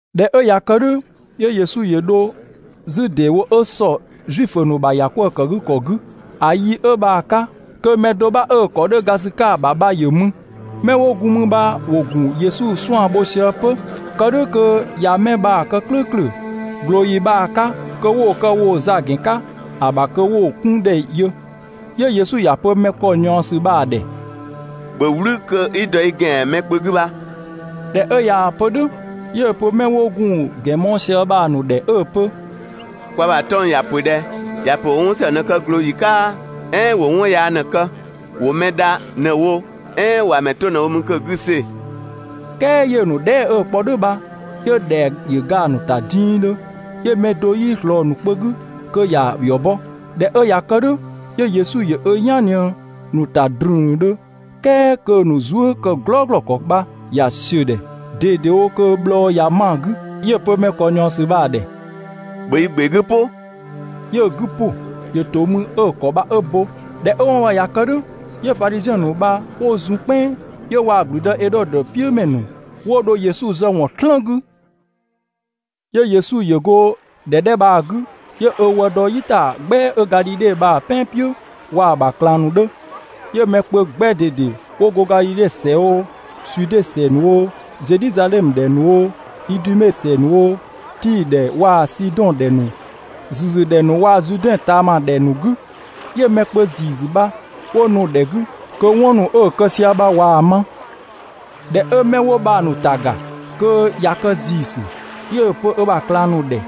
꞊Dhɛ 'ö ꞊ya kë "dhʋ̈, 'yö Yesu ‑yö dho 'zü ‑deewo 'ö ‑sɔ Zuifö ‑nu ‑bha ‑yakwëëkëgükɔ 'gü. ‑A yi 'ö bha‑ 'ka, kö mɛ do 'bha 'ö‑ ‑kɔ 'dhö ga ‑sü 'ka‑ ‑bha bha ‑yö mü. 'Mɛ 'wo gun mü bha ‑wo ‑gun Yesu 'suan‑ bho sië 'pö, kë "dhʋ̈ kö ꞊ya 'mɛ bha‑ kë "klʋ̈ʋ̈klʋ̈ ꞊glooyi bha‑ 'ka kö 'wo‑ kë woo‑ za ‑gɛn 'ka ‑a ‑bha kö 'wo‑ 'kun ‑dhɛ yö. 'Yö Yesu ‑ya pö mɛ ‑kɔ ꞊niɔɔsü bha‑ ‑dhɛ: «‑Bhö "wlü kö 'i dɔ i ‑gɛan mɛ kpö 'gü bha!» ꞊Dhɛ 'ö ꞊yaa‑ pö "dhʋ̈, 'yö‑ pö 'mɛ 'wo gun‑ ‑gɛn mɔɔ‑ sië bha‑ ‑nu ‑dhɛ 'ö‑ pö: «Kwa ‑bha 'tɔng‑ ‑ya ‑pö ꞊dhɛ? ‑Ya ‑pö ‑wo 'wɔn ‑së ꞊në‑ kë ꞊glooyi 'ka "ɛɛn ‑wo 'wɔn yaa ꞊në‑ kë? ‑Wo mɛ dha ꞊në‑ wo, "ɛɛn ‑wa ‑mɛ 'to ꞊në‑ wo mü kö‑ 'gü‑ see‑?» "Kɛɛ 'yö‑ ‑nu dhɛɛ" 'ö‑ kpɔ "dhʋ̈ bha, 'yö ‑dhɛa ‑yö ga‑ ‑nu ‑ta dingdhö, 'yö mɛ do 'yii ꞊slɔɔ‑ ‑nu kpö 'gü kö ‑ya ‑yɔ bɔ. ꞊Dhɛ 'ö ꞊ya kë "dhʋ̈, 'yö Yesu ‑yö ö "yan ꞊nië‑ ‑nu ‑ta ‑drüüüdhö, "kɛɛ kö‑ ‑nu zuë" ‑kë "glɔɔglɔɔ ‑kɔ bha, ꞊ya ‑siö ‑dhɛ ꞊dedewo kö bhlɔɔ ꞊ya 'ma‑ 'gü. 'Yö‑ pö mɛ ‑kɔ ꞊niɔɔsü bha‑ ‑dhɛ: «‑Bhö i ‑gbe 'gü "pʋ!» 'Yö‑ 'gü ‑pʋ, ‑yö ‑to mü 'ö‑ ‑kɔ bha 'ö bo. ꞊Dhɛ 'ö 'wɔn bha ꞊ya kë "dhʋ̈, 'yö Fadhiziɛn ‑nu bha 'wo zun "kpɛnng, 'yö waa‑ ‑gblüdë Edhodö "piʋ̈ ‑mɛ ‑nu 'wo dho Yesu zë ‑wɔn "slën 'gü. 'Yö Yesu ‑yö go ‑dhɛ 'dhɛ bha‑ 'gü, 'yö ö wë dɔ "yitagbɛa 'ö Gadhidhe bha‑ "pɛan "piʋ̈ waa‑ ‑bha ꞊klang ‑nu 'dhö. 'Yö mɛ kpö 'gbɛ ꞊dede 'wo go Gadhidhe ‑sɛ oo, Zude ‑sɛ ‑nu oo, Zedhizadhɛmö ‑dhɛ ‑nu oo, Idume ‑sɛ ‑nu oo, Tii‑ ‑dhɛ waa‑ Sidɔn ‑dhɛ ‑nu ‑züzü ‑dhɛ ‑nu waa‑ Zuudɛn ꞊taama ‑dhɛ ‑nu 'gü, 'yö mɛ kpö ‑ziisü bha 'wo nu‑ ‑dhɛ 'gü, kö 'wɔn ‑nu 'ö‑ kë sië bha ꞊waa‑ ma. ꞊Dhɛ 'ö 'mɛ 'wo bha‑ ‑nu ‑ta ‑ga kö ꞊ya kë ‑ziisü, 'yö‑ pö ö ‑bha ꞊klang ‑nu ‑dhɛ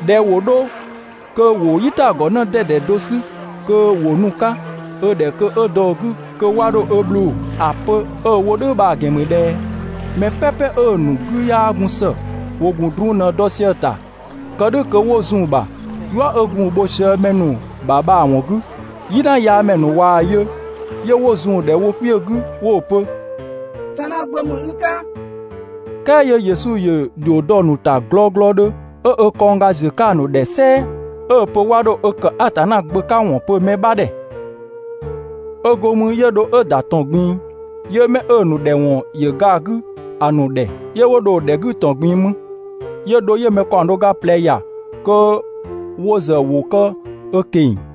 ꞊dhɛ ‑wo 'dho kö ‑wo "yitagɔ 'në 'dɛdɛ do 'sü kö ‑wo nu‑ 'ka ö ‑dhɛ kö 'ö dɔ‑ 'gü kö 'wa 'dho ö bhlʋʋ‑. ‑A pö 'ö‑ wo "dhʋ̈ bha‑ ‑gɛn ‑mü ꞊dhɛ mɛ "pɛpɛ 'ö‑ ‑nu 'gü 'yaa gun ‑së, ‑wo ‑gun drun ꞊në‑ dɔ sië‑ ‑ta kë "dhʋ̈ kö 'wo zun‑ ‑bha, "yua 'ö gun‑ bho sië mɛ ‑nu ‑bha bha‑ ‑wɔn 'gü. "Yinayaamɛ ‑nu ꞊waa‑ yö, 'yö 'wo zun‑ ‑dhɛ wo kpiö 'gü 'wo‑ pö: «Atanna Gbö ‑mü i 'ka!» "Kɛɛ 'yö Yesu ‑yö ‑dhio dɔ‑ ‑nu ‑ta glɔglɔdhö, 'ö ö kɔngga ꞊ziö‑ 'ka‑ ‑nu ‑dhɛ "sɛɛ 'ö‑ pö 'wa 'dho ö ‑kë Atanna Gbö 'ka ‑wɔn pö mɛ 'bha ‑dhɛ. 'Ö go mü 'yö dho 'ö ‑da ‑tɔn ꞊gbin‑, 'yö 'mɛ 'ö‑ ‑nu ‑dhɛ ‑wɔn ‑yö ga‑ 'gü ‑a ‑nu ‑dhɛ, 'yö 'wo dho‑ ‑dhɛ 'gü ‑tɔn ꞊gbin‑ mü. 'Yö dho 'yö‑ mɛ ‑kaɔng do ga ꞊plɛ ‑ya kö wo ‑zë ‑wo kë ö ꞊keng‑,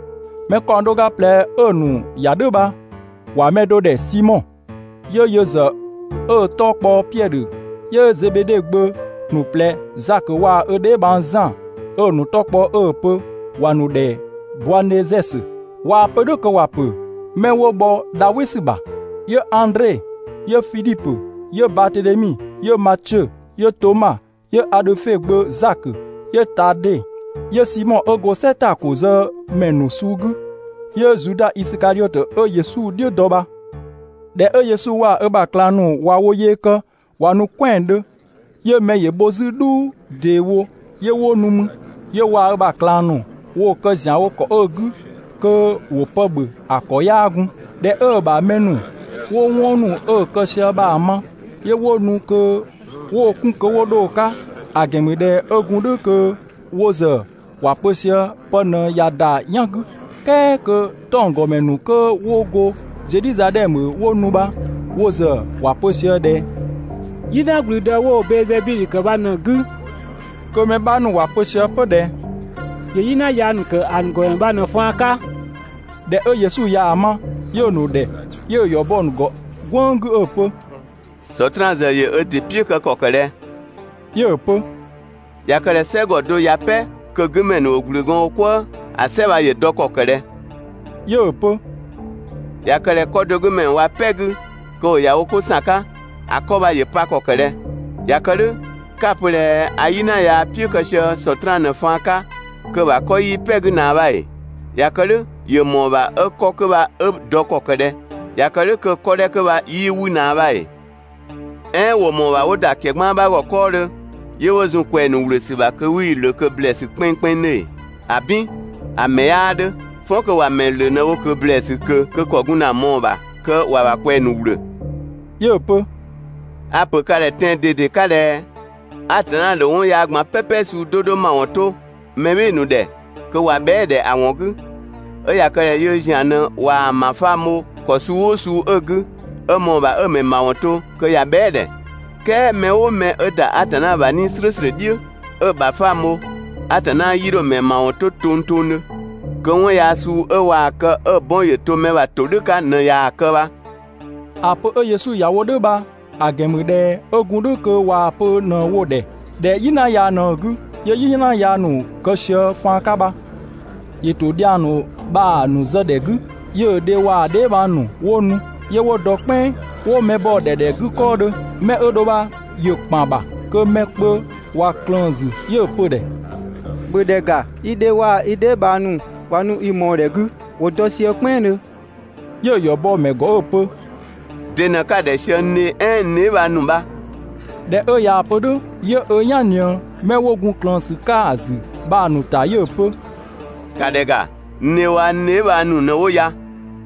Mɛ ‑kaɔng do ga ꞊plɛ 'ö‑ ‑nu ‑ya "dhʋ̈ bha, ‑wa mɛ do ‑dhɛ Simɔ, 'yö yö ‑zë 'ö‑ 'tɔ kpɔ Piɛdhö, 'yö Zebede gbö ‑nu ꞊plɛ Zakö waa‑ ö dheebhang Zan 'ö‑ ‑nu 'tɔ kpɔ 'ö‑ pö ‑wa ‑nu ‑dhɛ Boanɛzɛsö (꞊waa‑ pö "dhʋ̈ kö ‑wa ‑pö ‹'mɛ 'wo bhɔ dha "wɩ ‑sü ‑bha›), 'yö Andre, 'yö Fidhipö, 'yö Batedhemi, 'yö Matiö, 'yö Toma, 'yö Adhöfe gbö Zakö, 'yö Tade, 'yö Simɔ 'ö go "sɛ ‑ta ‑ko zë ‑mɛ ‑nu suu 'gü, 'yö Zuda Isikadhiɔtö 'ö Yesu "dhiʋ̈ dɔ bha. ꞊Dhɛ 'ö Yesu waa‑ ö ‑bha ꞊klang ‑nu ꞊wa wo yee kë ꞊wa nu "kwɛandhö, 'yö mɛ ‑yö bho 'zü "dhuu ‑deewo 'yö 'wo nu mü, 'yö waa‑ ö ‑bha ꞊klang ‑nu woo‑ kë ‑zianwo ‑kɔ 'ö 'gü kö ‑wo pë ‑bhö ‑a ‑kɔ 'yaa gun. ꞊Dhɛ 'ö‑ ‑bha mɛ ‑nu 'wo 'wɔn ‑nu 'ö‑ kë sië bha‑ ma, 'yö 'wo nu kö 'wo‑ 'kun kö 'wo 'dho‑ 'ka, ‑a ‑gɛn ‑mü ꞊dhɛ 'ö gun "dhʋ̈ kö wo ‑zë ‑wa pö sië pë ꞊në ꞊ya ‑da "yan 'gü. "Kɛɛ kö 'tɔnggɔmɛ ‑nu 'kö 'wo go Zedhizadhɛmö 'wo nu bha, wo ‑zë ‑wa pö sië ꞊dhɛ: «"Yina ‑gblüdë 'wo‑ Bɛɛzebidhö ‑kë bha ꞊në‑ 'gü, kö mɛ 'bha ‑nu ‑wa pö sië 'pö ꞊dhɛ ‑yö "yina yaa ‑nu ‑kë ‑a ‑nu ‑gɔmɛ bha ꞊në‑ faan 'ka. ꞊Dhɛ 'ö Yesu ꞊yaa‑ ma, 'yö‑ ‑nu ‑dhɛ, 'yö‑ ‑yɔ bɔ‑ ‑nu ‑gɔ "gwënng 'gü 'ö‑ pö: «Sɔtraan ‑zë ‑yö Sɔtraan "piʋ̈ kë ‑kɔ ‑kë ꞊dhɛ?» 'Yö‑ pö: «꞊Ya kë ꞊dhɛ "sɛgɔ do ꞊ya "pɛ kö‑ 'gü ‑mɛ ‑nu ‑wo ‑gblü gɔɔn wo "kwëë, ‑a "sɛ bha ‑yö dɔ ‑kɔ ‑kë ꞊dhɛ?» 'Yö‑ pö: «꞊Ya kë ꞊dhɛ 'kɔ do 'gü ‑mɛ ‑nu ꞊wa "pɛ 'gü kö ‑wo ‑ya 'ko ‑san 'ka, ‑a 'kɔ bha ‑yö pa ‑kɔ ‑kë ꞊dhɛ? ꞊Ya kë "dhʋ̈, 'ka‑ pö ꞊dhɛ a "yina yaa "piʋ̈ kë sië Sɔtraan ꞊në‑ faan 'ka, kö‑ ‑bha 'kɔ 'yii "pɛ‑ 'gü ꞊naa bha ‑ee? ꞊Ya kë "dhʋ̈, ‑yö ‑mɔɔ ‑bha 'ö‑ 'kɔ 'kö bha ö dɔ ‑kɔ ‑kë ꞊dhɛ? ꞊Ya kë "dhʋ̈, kö‑ 'kɔ 'dhɛ 'kö bha 'yii 'wü ꞊naa bha ‑ee? "Ɛɛn ‑wo ‑mɔɔ ‑bha 'wo ‑da ‑kɛgbaan 'bha ‑gɔ 'kɔɔdhö, 'yö 'wo zun‑ ꞊kwɛɛ‑ ‑nu ‑wlö ‑sü ‑bha kö 'wii‑ ‑lö ꞊kö ‑blɛɛsü kpɛnngkpɛnngdhö ‑ee? ‑Abin! ‑A ‑mɛ 'yaa 'dhö. "Fɔn kö ‑wa ‑mɛ ‑lö ꞊në‑ wo ‑blɛɛsü ꞊kö kö ‑kɔ gun ‑na ꞊mɔɔ‑ ‑bha kö ‑wa ꞊kwɛɛ‑ ‑nu ‑wlö.» 'Yö‑ pö: «A‑ ‑pö ka ‑dhɛ tɛan‑ ꞊dede 'ka ꞊dhɛ: Atanna ‑dho 'wɔn yaa ꞊gban "pɛpɛ suu 'do 'do ‑mawɔn 'to mɛ "bhɩɩ‑ ‑nu ‑dhɛ (kö ꞊wa bhɛa"‑ ‑dhɛ ‑a ‑wɔn 'gü), 'ö ꞊ya kë ꞊dhɛ yöö ‑zian ꞊në ꞊waa‑ ‑bhafang bho ‑kɔ suu "ʋʋ suu 'ö‑ 'gü, 'ö ‑mɔɔ ‑bha 'ö‑ ‑mɛ ‑mawɔn to (kö ꞊ya bhɛa"‑ ‑dhɛ), "kɛɛ mɛ "ʋʋ mɛ 'ö ‑da Atanna ‑bha 'Nii‑ "slʋ̈ʋ̈slʋ̈ "dhiʋ̈, 'ö‑ ‑bhafang bho, Atanna 'yii 'dho‑ ‑mɛ ‑mawɔn 'to tongtongdhö. Kö 'wɔn yaa suu 'ö ꞊waa‑ kë 'ö‑ 'bɔn ‑yö to mɛ bha ‑todhʋ̈ 'ka ꞊në ꞊yaa‑ kë bha. ‑A pö 'ö Yesu ‑ya wo "dhʋ̈ bha, ‑a ‑gɛn ‑mü ꞊dhɛ 'ö gun "dhʋ̈ kö ꞊waa‑ pö ꞊në‑ wo‑ ‑dhɛ ꞊dhɛ "yina yaa ꞊në‑ 'gü, 'yö "yina yaa ‑nu kë sië‑ faan 'ka bha. ‑Yö ‑to dhiang ‑nu bha‑ ‑nu zë ‑dhɛ 'gü, 'yö‑ dhe waa‑ dheebhang ‑nu 'wo nu, 'yö 'wo dɔ "kpɛnng 'wo mɛ bɔ‑ ‑dhɛ ‑dhɛ 'gü 'kɔɔdhö. 'Mɛ 'ö dho bha ‑yö ‑kpan ‑bha kö mɛ kpö ꞊wa ꞊klëën‑ ‑zü, 'yö‑ pö‑ ‑dhɛ: «‑Bhö ‑dhɛ ‑ga, i dhe waa‑ i dheebhang ‑nu ꞊wa nu i mɔɔ‑ ‑dhɛ 'gü, ‑wo dɔ sië "kpɛnngdhö.» 'Yö‑ ‑yɔ bɔ‑ ‑mɛ ‑gɔ 'ö‑ pö: «De në 'ka‑ ‑dhɛ sië n dhe "ɛɛn n dheebhang ‑nu bha?» ꞊Dhɛ 'ö ꞊yaa‑ pö "dhʋ̈, 'yö ö "yan ꞊nië 'mɛ 'wo gun ꞊klëën ‑sü 'ka‑ ‑zü bha‑ ‑nu ‑ta 'yö‑ pö: «‑Ka ‑dhɛ ‑ga, n dhe waa‑ n dheebhang ‑nu ꞊në 'wo ya.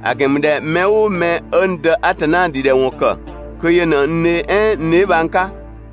‑A ‑gɛn ‑mü ꞊dhɛ mɛ "ʋʋ mɛ 'ö n Dë Atanna ‑dhidhɛwɔn ‑kë kö yö ꞊në n dhe "ɛɛn n dheebhang 'ka.»